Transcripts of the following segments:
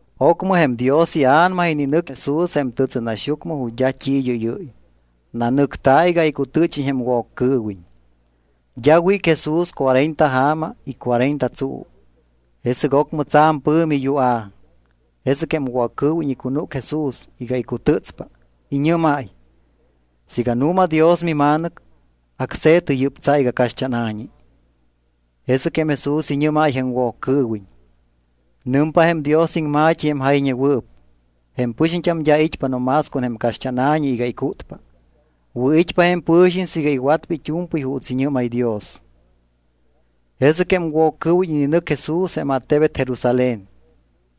Ocmɨ jém Dios iA̱nama ininɨc Jesús jém tɨtsɨnaxyucmɨ ju̱t́ d́a t́i id́ɨ́yɨ́y. Nanɨcta̱ iga icutɨ́chiñ jém Woccɨɨwiñ. D́a wíc Jesús cuarenta ja̱ma y cuarenta tsuu. Jesɨc ocmɨ tsa̱m pɨ̱mi yua̱p. Jesɨc jém Woccɨɨwiñ icunúc Jesús iga icutɨ́tspa. Iñɨ́máy: —Siiga nu̱ma Dios miMa̱nɨc, acse̱tɨ yɨ́p tsa iga caxt́ána̱ñi. Jesɨc Jesús iñɨ́máy jém Woccɨɨwiñ: —Nɨmpa jém Dios iŋma̱t́i jém jayñewɨɨp: “Jém pɨxiñt́am d́a it́pa no más con jém caxt́ána̱ñi iga icútpa. Wɨ̱it́pa jém pɨ̱xiñ siiga iwatpa it́u̱mpɨy juuts iñɨ́máy Dios.” Jesɨc jém Woccɨɨwiñ ininɨc Jesús jém attebet Jerusalén.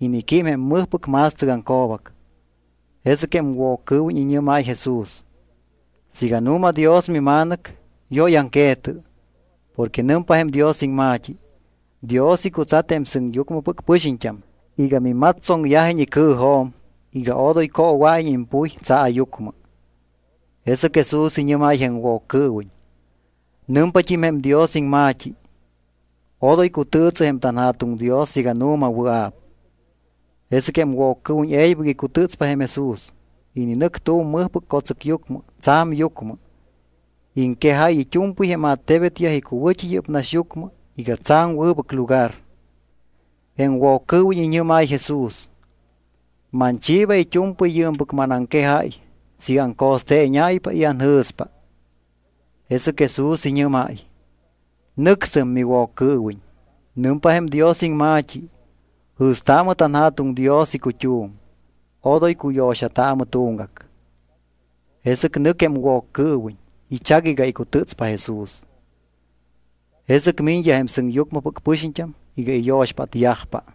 Iniquím jém mɨjpɨc ma̱stɨcaŋco̱bac. Jesɨc jém Woccɨɨwiñ iñɨ́máy Jesús: —Siiga nu̱ma Dios miMa̱nɨc, yóyaŋque̱tɨ. Porque nɨmpa jém Dios iŋma̱t́i: Dios icutsat jém sɨŋyucmɨpɨc pɨxiñt́am iga mimatstsoŋyajiñ icɨɨjo̱m iga odoy coowa̱iñ impuy tsaayucmɨ. Jesɨc Jesús iñɨ́máy jém Woccɨɨwiñ: —Nɨmpat́im jém Dios iŋma̱t́i: “Odoy cutɨɨtsɨ jém tanJa̱tuŋ Dios siiga nu̱ma wɨa̱p.” Jesɨc jém Woccɨɨwiñ e̱ybɨc icutɨ́tspa jém Jesús. Ininɨc tu̱m mɨjpɨc co̱tsɨcyucmɨ tsa̱m yucmɨ. Iŋquejáy it́u̱mpɨy jém attebetyaj icuwɨ̱t́i yɨ́p naxyucmɨ iga tsa̱m wɨbɨc lugar. Jém Woccɨɨwiñ iñɨ́máy Jesús: —Manchiiba it́u̱mpɨy yɨɨmpɨc manaŋquejáy siiga aŋco̱steeñáypa y anjɨ̱spa. Jesɨc Jesús iñɨ́máy: —Nɨcsɨm, miWoccɨɨwiñ. Nɨmpa jém Dios iŋma̱t́i: “Jɨ̱staamɨ tanJa̱tuŋ Dios icut́um. Odoy cuyo̱xataamɨ tuŋgac.” Jesɨc nɨc jém Woccɨɨwiñ. Ichac iga icutɨ́tspa Jesús. Jesɨc miñyaj jém sɨŋyucmɨpɨc pɨxiñt́am iga iyo̱xpátyajpa.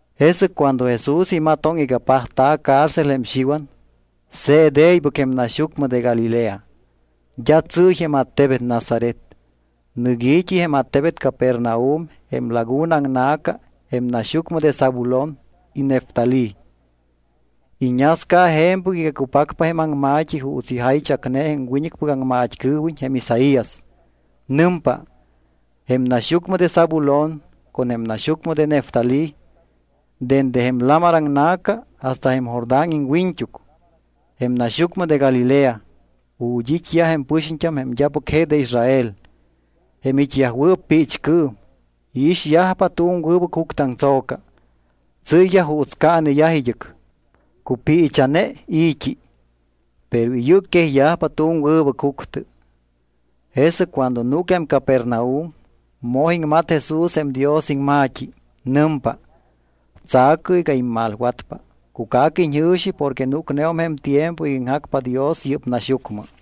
Jesɨc cuando Jesús imatoŋ iga pajta̱ cárcel jém Xiwan, se̱t e̱ybɨc jém naxyucmɨ de Galilea. D́a tsɨ́y jém attebet Nazaret. Nɨc i̱t́i jém attebet Capernaum jém laguna aŋna̱ca jém naxyucmɨ de Zabulón y Neftalí. Iñasca je̱mpɨc iga cupacpa jém aŋma̱t́i juuts ijaychacne jém wiñɨcpɨc aŋmat́cɨɨwiñ jém Isaías. Nɨmpa: Jém naxyucmɨ de Zabulón con jém naxyucmɨ de Neftalí dende jém lamar aŋna̱ca hasta jém Jordán iŋwiñt́uc, jém naxyucmɨ de Galilea, ju̱t́ it́yaj jém pɨxiñt́am jém d́apɨc je de Israel, jém it́yajwɨɨp piichcɨɨm; iixyajpa tu̱m wɨbɨc juctɨaŋtso̱ca. Tsɨ́yyaj juuts caaneyaj id́ɨc. Cupiicha̱ne i̱t́i, pero iyɨcquejyajpa tu̱m wɨbɨc juctɨ. Jesɨc cuando núc jém Capernaum, moj iŋmat Jesús jém Dios iŋma̱t́i. Nɨmpa: —Tsa̱cɨ iga immalwatpa, cuca̱cɨ iñjɨ̱xi porque núcneum jém tiempo iga iŋjacpa Dios yɨ́p naxyucmɨ.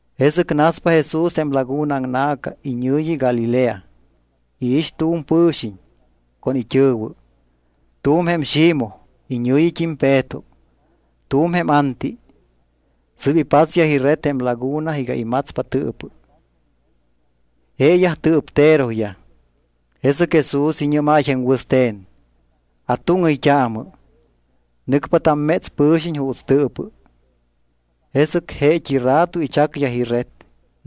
Jesɨc naspa Jesús jém laguna aŋna̱ca iñɨ̱yi Galilea. Iix tu̱m pɨ̱xiñ con it́ɨ̱wɨ. Tu̱m jém Ximoj, iñɨ̱yit́im Peto; tu̱m jém Anti. Sɨ́p ipatsyaj ired jém laguna iga imatspa tɨɨpɨ. Jeeyaj tɨɨpteroyaj. Jesɨc Jesús iñɨ́máy jém wɨste̱n: —Atúŋɨyt́aamɨ. Nɨcpa tamméts pɨ̱xiñ juuts tɨɨpɨ. Jesɨc jeet́i rato ichacyaj ired,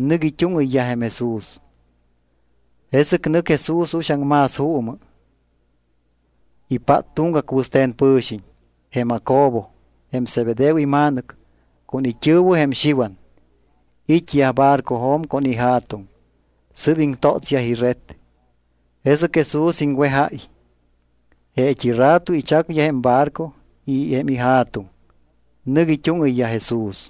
nɨc it́úŋɨyyaj jém Jesús. Jesɨc nɨc Jesús uxaŋ más juumɨ, ipát tuŋgac wɨste̱n pɨ̱xiñ. Jém Jacobo, jém Zebedeo ima̱nɨc, con it́ɨ̱wɨ jém Xiwan. It́yaj barcojo̱m con ija̱tuŋ. Sɨ́p iŋtótsyaj ired. Jesɨc Jesús iŋwejáy. Jeet́i rato ichacyaj jém ibarco y jém ija̱tuŋ. Nɨc it́úŋɨyyaj Jesús.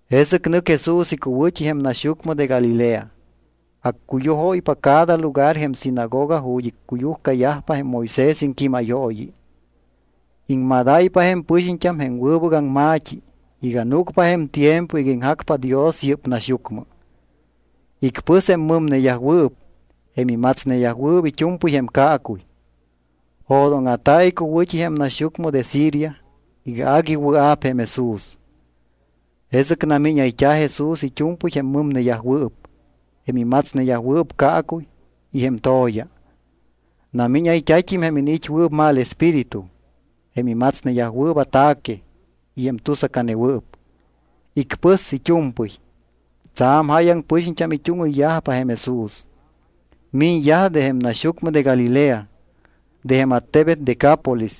Jesɨc nɨc Jesús icuwɨ̱t́i jém naxyucmɨ de Galilea. Accuyujóypa cada lugar jém sinagoga ju̱t́ icuyujcayajpa jém Moisés iŋquímayooyi. Iŋmadáypa jém pɨxiñt́am jém wɨbɨc aŋma̱t́i iga núcpa jém tiempo iga iŋjacpa Dios yɨ́p naxyucmɨ. Icpɨs jém mɨmneyajwɨɨp jém imatsneyajwɨɨp it́u̱mpɨy jém caacuy. Jo̱dóŋa̱ta̱ icuwɨ̱t́i jém naxyucmɨ de Siria iga agui wɨa̱p jém Jesús. Jesɨc namíñayt́a̱ Jesús it́u̱mpɨy jém mɨmneyajwɨɨp, jém imatsneyajwɨɨp caacuy y jém to̱ya. Namíñayt́a̱t́im jém iniit́wɨɨp mal espíritu, jém imatsneyajwɨɨp ataque y jém tusacanewɨɨp. Icpɨs it́u̱mpɨy. Tsa̱m jáyaŋ pɨxiñt́am it́úŋɨyyajpa jém Jesús. Miñyaj de jém naxyucmɨ de Galilea, de jém attebet Decápolis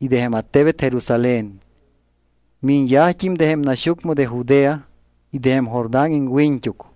y de jém attebet Jerusalén. Miñyajt́im de jém naxyucmɨ de Judea y de jém Jordán iŋwiñt́uc.